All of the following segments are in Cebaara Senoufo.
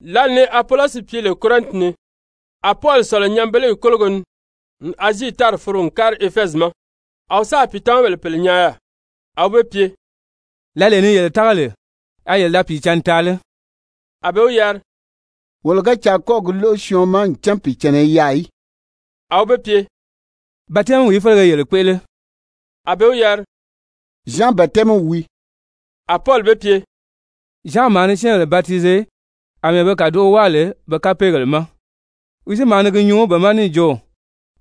Lǎli ni Apolɔsi pye lè Korɛnti ni, a Pɔli sɔ̀lɔ nyanbeleyi kólogo ni n Azii tári foro n kári Efɛzi ma. A wi sáà pìitamabèle pèle nyaa yaà. A wi be pye: «Lǎlee ni yele tága lè, a yele da Pìicǎnni taa lé?» A be wi yari: «Wolo ga caa kɔ́ɔ̀ gi lóʔo syɔɔn ma ncan Pìicànna i yaà í.» A wi be pye: «Batɛmi félegìí yele kpéʔele?» A be wi yari: «Zyan batɛmiw wii.» A Pɔli be pye: «Zyan maa ni syɛ́ɛnbèle batize àmɛɛ be kàdoʔo wáa lè be kapeegèle ma. Wi si maa ni gi nyuu be ma níì jo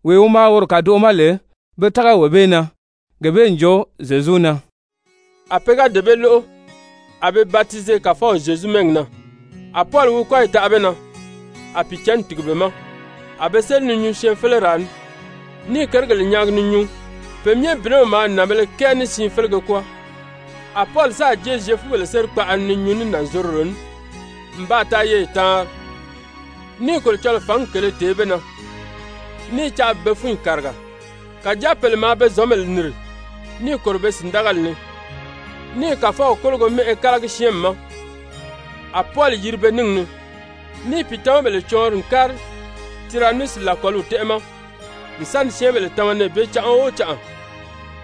wee wi maa woro kàdoʔo ma lè pe tága wee bee na, gee bee n jo Zyezu na.» A pe ga dee bee lóʔo, a be batize Kàfɔw Zyezu mɛ́ɛgi na. A Pɔli wi kɔ́yi taʔa be na, a Pìicǎnni tìgi be ma. A be séli ni nyuu syɛɛnfeleraa ni, ní i kérigèle nyaagi ni nyuu. Pe myɛ bìnɛw maa nànbēle kɛɛ ní siin félege kwɔ́ɔ. A Pɔli sáà jée Zyefubèle sérikpaʔa ni ni nyuu ní nànzorodo ní n baa taa yeye taanri, ní i Kolocɔlɔɔ fǎngi kèlē tèé be na, ní i caa bi be fúnyi kàriga. Kàjáa pèle maa be zɔ̌nbèle nìri níì kòro be sìndagali ni, ní i Kàfɔw kólogo mɛ́ʔɛ kálagi syɛ́ɛnmi ma, a Pɔli yiri pe níngi ni, níì pìitamabèle cɔɔnri n kári Tiranusi làkɔliw tɛ́ʔɛ ma n sa ni syɛ́ɛnbèle tama nɛɛ bee canʔa o canʔa.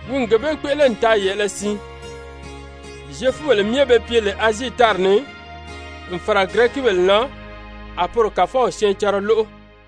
Wi n gee bee kpéʔele n taa yɛ̀ʔɛlɛ siin, Zyefubèle myɛ be pye lè Azii tári ni, n fàra Girɛkibèle na, a poro Kàfɔw syɛɛncanra lóʔo.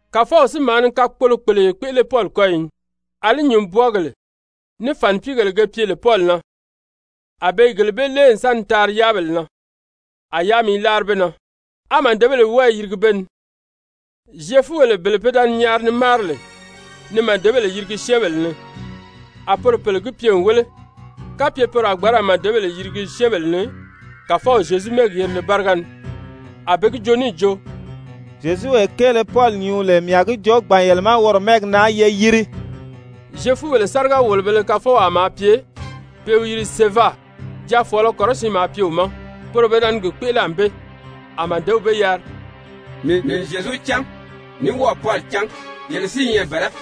Kàfɔw si maa ni kakpolo-kpèleye kpéʔele Pɔli kɔ́yi ni. Alí nyùnbwɔɔgèle ní fànipiigèle ge pye lè Pɔli na, a be i gele bee lée n sa ni taari yáabèle na, a yáami i láari be na, á màdebèle wɔ́ɔ i yirigi be ni. Zyefubèle bele pe da ni nyaari ni máari lè ni màdebèle yirigi syɛ́ɛnbèle ni, a poro pèle gi pye n wéle kapye poro a gbǎn ra màdebèle yirigi syɛ́ɛnbèle ni Kàfɔw Zyezu mɛ́ɛgi yerile báriga ni, a pe gi joo níì jo: «Zyezuwee kéele Pɔli nyuu lè mii a gi joo gbàn yele ma woro mɛ́ɛgi na ye yiri.» Zyefubèle sáriga-wòlobēle kafɔwaa maa pye pe i wi yiri Seva, jaafɔɔlɔ kɔrɔsiin maa pye wi ma, poro pe da ni gi kpéʔele ànbée. A màdew be yari: «Mii n Zyezu cán, ní wɔ́ɔ̀ Pɔli cán, yele si i nyɛ bɛ̀lɛ́?»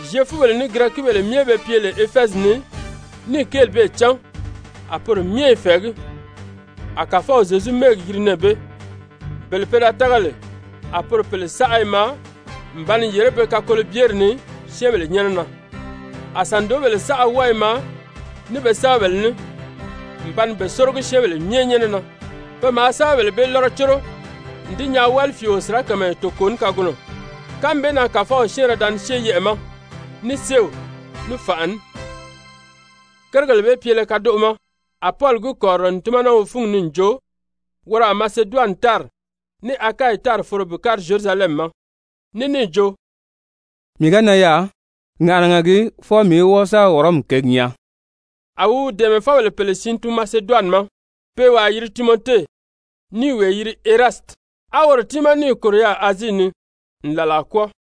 Zyefubèle ní Girɛkibèle myɛ be pye lè Efɛzi ni níì kéeli bee cán, a poro myɛ i fɛ̀ɛgí. A Kàfɔw Zyezu mɛ́ɛgi yiri nɛɛ bee. Bele pe da tága lè, a poro pèle saʔa i maa n ba ni yèré be kakolobyeri ni syɛ́ɛnbèle nyɛ́nɛ na. A sàndoobèle saʔa wɔ́ɔ i maa ní be sɛ́bɛbèle ní n ba ni be sórogi syɛ́ɛnbèle myɛ nyɛ́nɛ na. Pe maa sɛ́bɛbèle bee lɔ́rɔ córo n di nyaa wálifiio sirakamayɛ toko ní kagunɔ. Kánmi bee na Kàfɔw syɛ́ɛnrɛ da ni syée yɛʔɛ̀ ma ní séew, ní fànʔa ní. Kérigèle bee pyele kadoʔo ma a Pɔli gi kɔ̀rirɔ n tímana wi fúngi ni n jo woro a Maseduwani tári ní Akayi tári foro bi kári Zyerusalɛmi ma, ní níì jo: «Mii ga nan yaà, ŋàʔanaga gii fwɔɔ mii í wɔ́ɔ sa Wɔrɔmi kěgi nyaa.» A wi wi dɛ̀ɛmɛfɔbèle pèle siin tun Maseduwani ma, pe i wàa yiri Timɔte ní i wee yiri Erasiti, á woro tiimaa níì kòro yaà Azii ni n làlaa kwɔ́ɔ.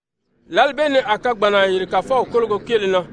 Lǎli bee ni a kagbanna yìri Kàfɔw kólogo kéele na.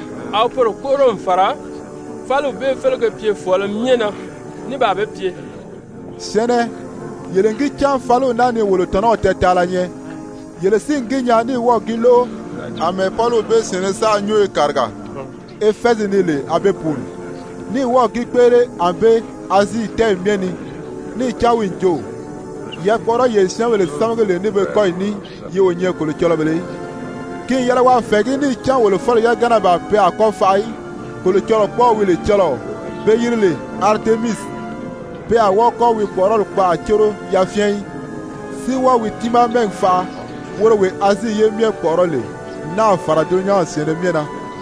A wi poro kpóʔoro n fàra fáliw bee félege pyefɔɔlɔ myɛ na ní baa be pye: «Syɛ̀ɛnnɛ, yele n gi cán fáliw naa ni wolo tɔ̀nɔw tɛɛtaala nyɛ. Yele si n gi nyaa ní wɔ́ɔ̀ gi lóʔo, àmɛɛ Pɔliw bee syɛ̀ɛnnɛ saʔa nyúnyo kàriga Efɛzi ni lè a be pùuni, ní wɔ́ɔ̀ gi kpéʔele ànbée Azii tɛ́ɛyi myɛ ni, níì cán wi n jo, yakpɔʔɔrɔyee syɛ́ɛnbèle sámagi lè ní be kɔ́yi ní, yi o nyɛ kolocɔlɔbèlē í. Ki n yɛlɛ waa fɛ̀ɛgí níì cán wolo fáliw yagana ban pe a kɔ́ faʔa í, kolocɔlɔkpɔɔw wi lè cɔlɔɔ be yiri lè Aritemisi, pe a wɔ́ɔ kɔ́ wi kpɔ̀ʔɔrɔli kpaʔa córo yafyɛn í, si wɔ́ɔ wi tiimaa mɛ́ɛgi faʔa, woro wee Azii ye myɛ kpɔ̀ʔɔrɔ́ lè, n náà fàra dulunyanw syɛ̀ɛnnɛ myɛ na.»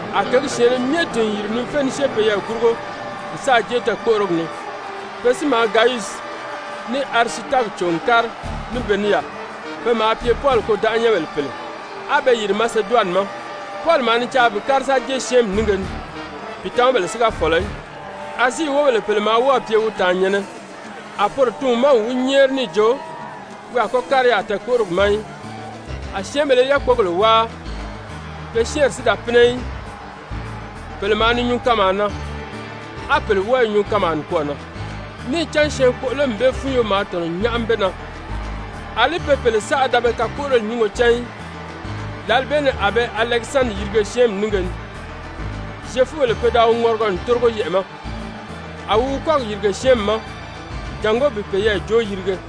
A kěgi syɛ̀ɛnnɛ myɛ tìn n yìri ni fé ni syée peyɛɛ gurugo n sáà jée tɛɛ̀kpoʔorogi ni. Pe si maa Gayusi ní Arisitaki cò n kári ní be ní yaà. Pe maa pye Pɔli kôdanʔanyɛnbèle pèle, á be yìri Maseduwani ma. Pɔli maa ni caa bi kári sa jée syɛ́ɛnmi nínge ni, pìitamabèle si ga fɔ̀lɔ í. Azii wóbèle pèle maa wɔ́ɔ̀ pye wi tàannyɛ̀nnɛ, a poro tun wi ma n wi nyɛ́ɛri níì jo wi a kɔ́ kári yaà tɛɛ̀kpoʔorogi ma í. A syɛ́ɛnbèle i yákpogèle wáa, pe syɛ́ɛnri si da pínɛ í, pèle maa ni nyuu kanmaa na, á pèle wɔ́ɔ i nyuu kanmaa nikwɔɔ na, níì cán syɛɛnkpoʔolomi bee fúnyo maa tɔ̀nɔ n nyáʔami be na, àlí pe pèle saʔa da be kakpoʔoroli nyúngo cán í. Lǎli bee ni a be Alɛkisandiri yirige syɛ́ɛnmi nínge ni, Zyefubèle pe da wi ŋɔrigɔ n tórigo yɛʔɛ̀ ma. A wi wi kɔ́gi yìrige syɛ́ɛnmi ma jàngó bi peyɛɛ joo yirige.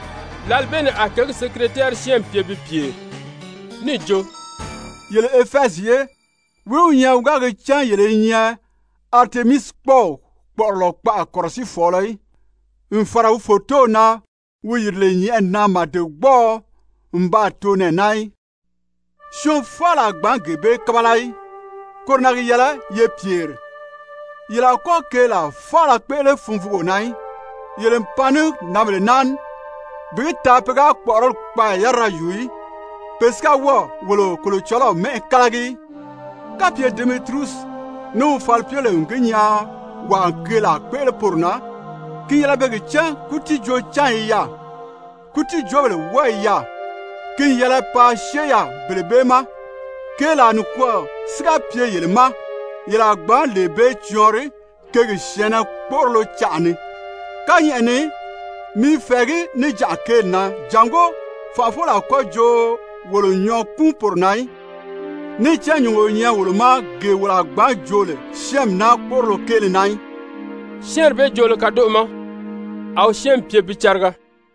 Lǎli bee ni a kěgi sekiretɛɛri syɛ́ɛnmi pye pi pyèri níì jo: «Yele Efɛzi ye, wìí wi nyɛ wi ga gi cán yele i nyɛ Aritemisikpɔɔw kpɔ̀ʔɔrɔlɔ kpaʔa kɔ̀rɔsiifɔɔlɔ í, n fàra wi fòtow na wi yìri lè nyɛ̀ʔɛni na màdegbɔɔɔ n baa too nɛɛ naa í? Syɔɔn faala a gbǎn gee bee kábala í, koro na gi yɛlɛ ye pyèri. Yele a kɔ́ keelaa faala kpéʔele funvuugo na í. Yele n pan ní nǎnbèle naa ní, bi gi taa pe ga kpɔ̀ʔɔrɔli kpaaya yárira yùu í, pe si ga wɔ́ɔ̀ wolo kolocɔlɔw mɛ́ʔɛ kálagi í. Kapye Demɛtiriyusi ní wi falipyebèle n gi nyaa wàa n keelaa kpéʔele poro na, ki n yɛlɛ pe gi cán kútiijoo-cányi i yaà, kútiijoobèle wɔ́ɔ i yaà, ki n yɛlɛ paa syée yaà bele bee ma. Keelaa nikwɔɔ si ga pye yele ma, yele a gbǎn lee bee cɔɔnri kěgi syɛ̀ɛnnɛ kpóʔorolo canʔa ni. Kányɛʔɛ ni mii i fɛ̀ɛgí níjanʔa kéeli na jàngó fànʔafɔbèle a kɔ́ jo wolo n nyɔɔ kúun poro na í. Níì cán nyùngo o nyɛ wolo ma gee wolo a gbǎn joo lè syɛ́ɛnmi naa kpóʔorolo kéele na í.» Syɛ́ɛnri bee joolo kadoʔo ma, a wi syɛ́ɛnmi pye bi cariga.